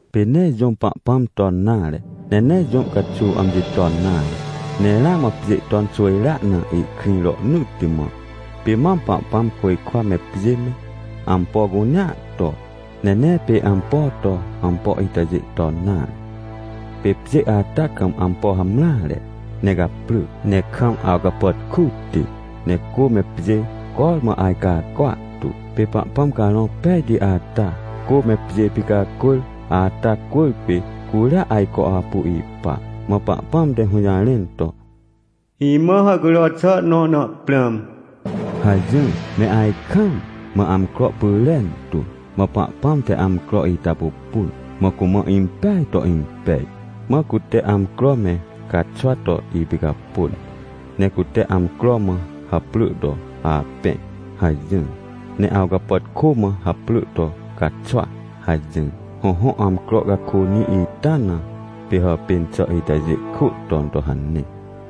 Pê nee jũm Pahpãm ton nare, ne nee jũ caxuw amji ton nare, ne ramã pjê ton xwỳjrea na ihkrĩ rohnỳtti mã. Pê mam Pahpãm côjkwa me pjê me, ampo cunea to. Ne nee pê ampo to, ampo itajê ton nare. Pê pjê ata kam ampo hamreare, ne caprỳ, ne kam awcapàtkuti, ne cô me pjê cormã ajcacwa tu. Pê Pahpãm Carõ Pejti ata, cô me pjê picacwỳr ata cwỳrpê, curia ajco apu ipa. Mã Pahpãm te hũjarẽn to: — Imã hàhcujro xà nõ na prãm! — hajỹr me ajkaam, mã amcro pyrentu. Mã Pahpãm te amcro ita pupun, mã cumã impeaj to impej, mã cute amcro me caxwa to ipicapôn. Ne cute amcro mã haprỳ to: “Apẽ” hajỹr, ne awcapàtkô mã haprỳ to: “Caxwa” hajỹr. Hõhõ, amcro cakônĩ ita na, pê hapên xà itajê kwỳ ton to hane.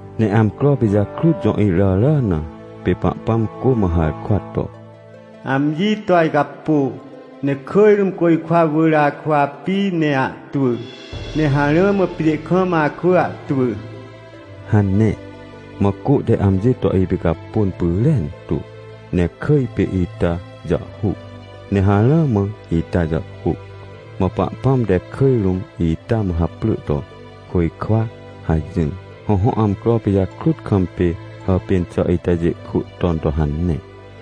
Ne amcro pijakrut jõ iràrà na, pê Pahpãm cô mã harkwa to: — Amji to ajcapô, ne kỳj rũm côjkwa wỳr akwỳ api ne ahtwỳ, ne harã mã pjê kam akwỳ ahtwỳ — hane. Mã cô te amji to ipicapôn pyrentu, ne kỳj pê ita jàhhuc, ne harã mã ita jàhhuc. Mã Pahpãm te kỳj rũm ita mã haprỳ to: “Côjkwa” hajỹr. Hõhõ, amcro pijakrut kam pê hàpên xà itajê kwỳ ton to hane.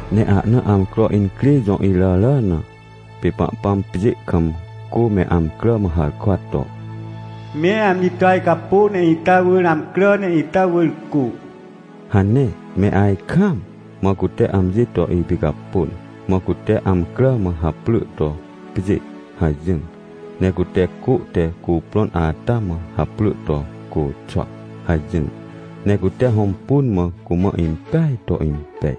Ne ahna amcro incrê jõ iràrà na, pê Pahpãm pjê kam cô me amcrà mã harkwa to: — Me amji to ajcapô, ne ita wỳr amcrà, ne ita wỳr cô — hane me ajkaam, mã cute amji to ipicapôn. Mã cute amcrà mã haprỳ to: “Pjê” hajỹr. Ne cute cô te cuprõn ata mã haprỳ to: “Côxwa” hajỹr. Ne cute hõmpun, mã cumã impeaj to impej.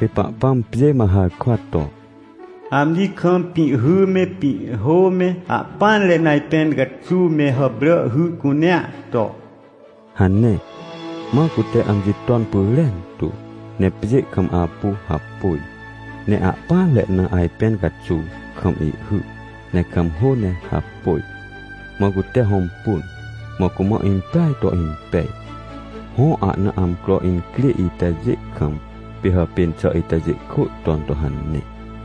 Pê Pahpãm pjê mã harkwa to: — Amji kam pĩhhy me, pĩhhô me, ahpỹanre na ajpẽn caxuw me hàprà hy cunea to — hane. Mã cute amji ton pyrentu, ne pjê kam apu hapôj. Ne ahpỹanre na ajpẽn caxuw kam ihhy, ne kam hô ne hapôj. Mã cute hõmpun, mã cumã impeaj to impej. Hõ, ahna amcro incrê itajê kam, pê hàpên xà itajê kwỳ ton to hane.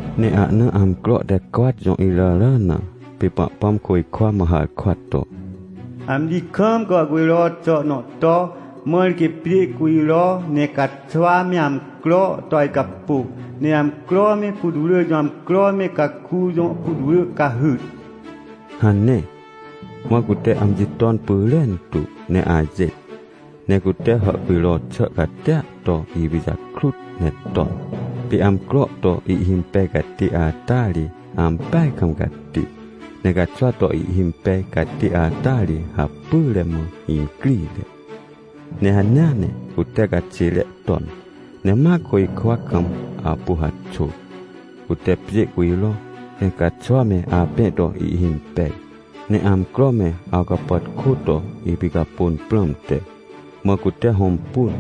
Ne ahna amcro te cwat jõ iràrà na, pê Pahpãm côjkwa mã harkwa to: — Amji kam gàhcujro xà nõ to, mãr quê pjê cujro, ne caxwa me amcro to ajcapô, ne amcro me, putwrỳ jõ amcro me, caku jõ putwrỳ cahyt — hane. Mã cute amji ton pyrentu ne ajêt. Ne cute hàhcujro xà catia to ipijakrut ne ton. Pê amcro to ihhimpej catê ata ri ampeaj kam cati, ne caxwa to ihhimpej catê ata ri hapyre mã incrire. Ne hanea ne cute caxêre ton. Ne ma côjkwa kam apu haxôr, cute pjê cujro, ne caxwa me apẽ to ihhimpej, ne amcro me awcapàtkô to ipicapôn prãmte. Mã cute hõmpun,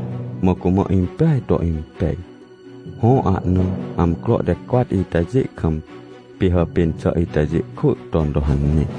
mã cumã impeaj to impej. Hõ, ahna amcro te cwat itajê kam, pê hàpên xà itajê kwỳ ton to hane.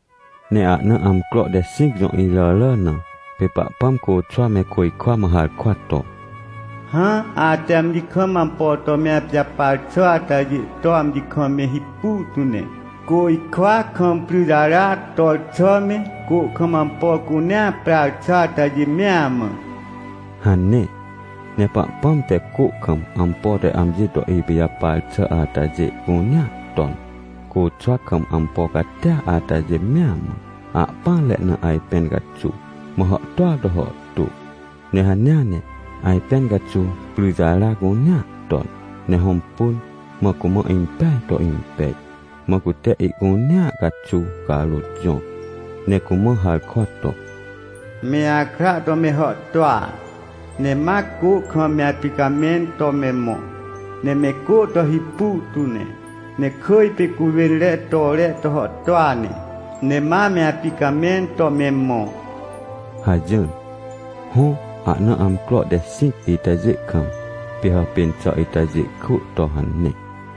Ne ahna amcro te xĩc jõ iràrà na, pê Pahpãm côxwa me côjkwa mã harkwa to: — Hã, ate amji kam ampo to me apijapar xà atajê to amji kam me hipu tu ne, côjkwa kam pryjara tor xà me, cô kam ampo cunea prar xà atajê mea mã — hane. Ne Pahpãm te cô kam ampo te amji to ipijapar xà atajê cunea ton, côxwa kam ampo catia atajê mea mã, ahpỹanre na ajpẽn caxuw, mã hàhtôa to hàhtô. Ne hanea ne, ajpẽn caxuw pryjara cunea ton, ne hõmpun, mã cumã impeaj to impej. Mã cute ihcunea caxuw carôt jõr ne cumã harkwa to: — Me akra to me hàhtôa, ne ma cô kam me apicamẽn to me mõ, ne me cô to hipu tu ne. Ne kỳj pê cuwênre tore to hàhtôa ne, ne ma me apicamẽn to me mõ — hajỹr. Hõ, ahna amcro te xĩc itajê kam, pê hàpên xà itajê kwỳ to hane.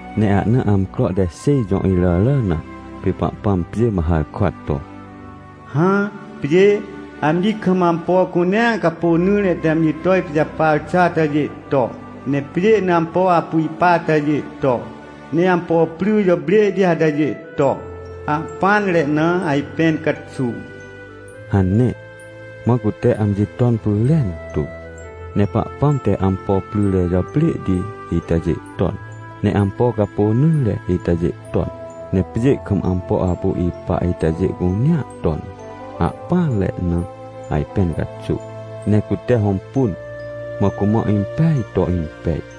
Ne ahna amcro te xêj jõ iràrà na, pê Pahpãm pjê mã harkwa to: — Hã, pjê, amji kam ampo cunea capônỹre te amji to ipijapar xà atajê to, ne pjê na ampo apu ipa atajê to, ne ampo pry jàprêhti atajê to, ne ahpỹanre na ajpẽn caxuw — hane. Mã cute amji ton pyrentu. Ne Pahpãm te ampo pryre jàprêhti itajê ton, ne ampo capônỹre itajê ton, ne pjê kam ampo apu ipa itajê cunea ton, ne ahpỹanre na ajpẽn caxuw. Ne cute hõmpun, mã cumã impeaj to impej.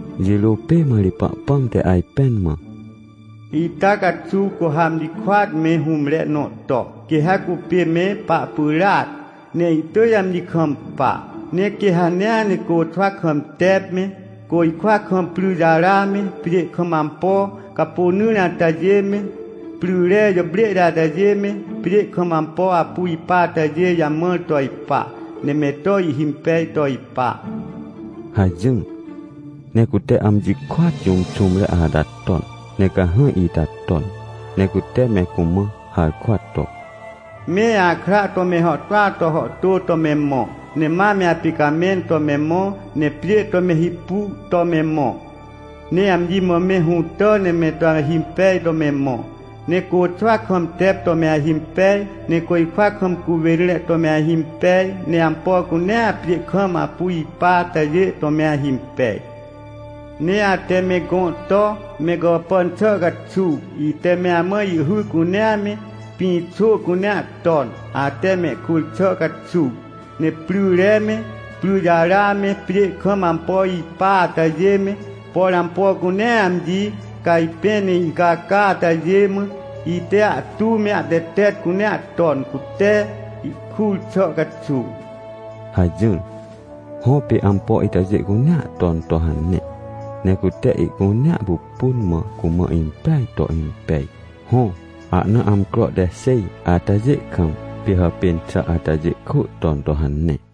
Jirô pê mã ri Pahpãm te ajpẽn mã: — Ita caxuw cu ha amji kôat me hũmre nõ to, quê ha cupê me pahpyràac, ne ihtỳj amji kampa. Ne quê ha hanea ne côxwa kam tep me, côjkwa kam pryjara me, pjê kam ampo capônỹre atajê me, pryre jàprêhti atajê me, pjê kam ampo apu ipa itajê jamãr to ipa, ne me to ihhimpej to ipa — hajỹr. Ne cute amji kôat jũm xũmre ata ton, ne cahãj ita ton. Ne cute me cumã harkwa to: — Me akra to me hàhtôa to hàhtô to me mõ, ne ma me apicamẽn to me mõ, ne pjê to me hipu to me mõ, ne amji mã me hũtà ne me to ahimpej to me mõ. Ne côxwa kam tep to me ahimpej, ne côjkwa kam cuwênre to me ahimpej, ne ampo cunea pjê kam apu ipa atajê to me ahimpej. — Ne ate me gõ to, me gàpàn xà caxuw, ite me amã ihhy cunea me, pĩxô cunea ton, ate mehkur xà caxuw. Ne pryre me, pryjara me, pjê kam ampo ipa atajê me, por ampo cunea amji cajpẽ ne incaca atajê mã, ite ahtu me ahtetet cunea ton, cute ihkur xà caxuw — hajỹr. Hõ, pê ampo itajê cunea ton to hane. Ne cute ihcunea pupun, mã cumã impeaj to impej. Hõ, ahna amcro te xêj atajê kam, pê hàpên xà atajê kwỳ ton to hane.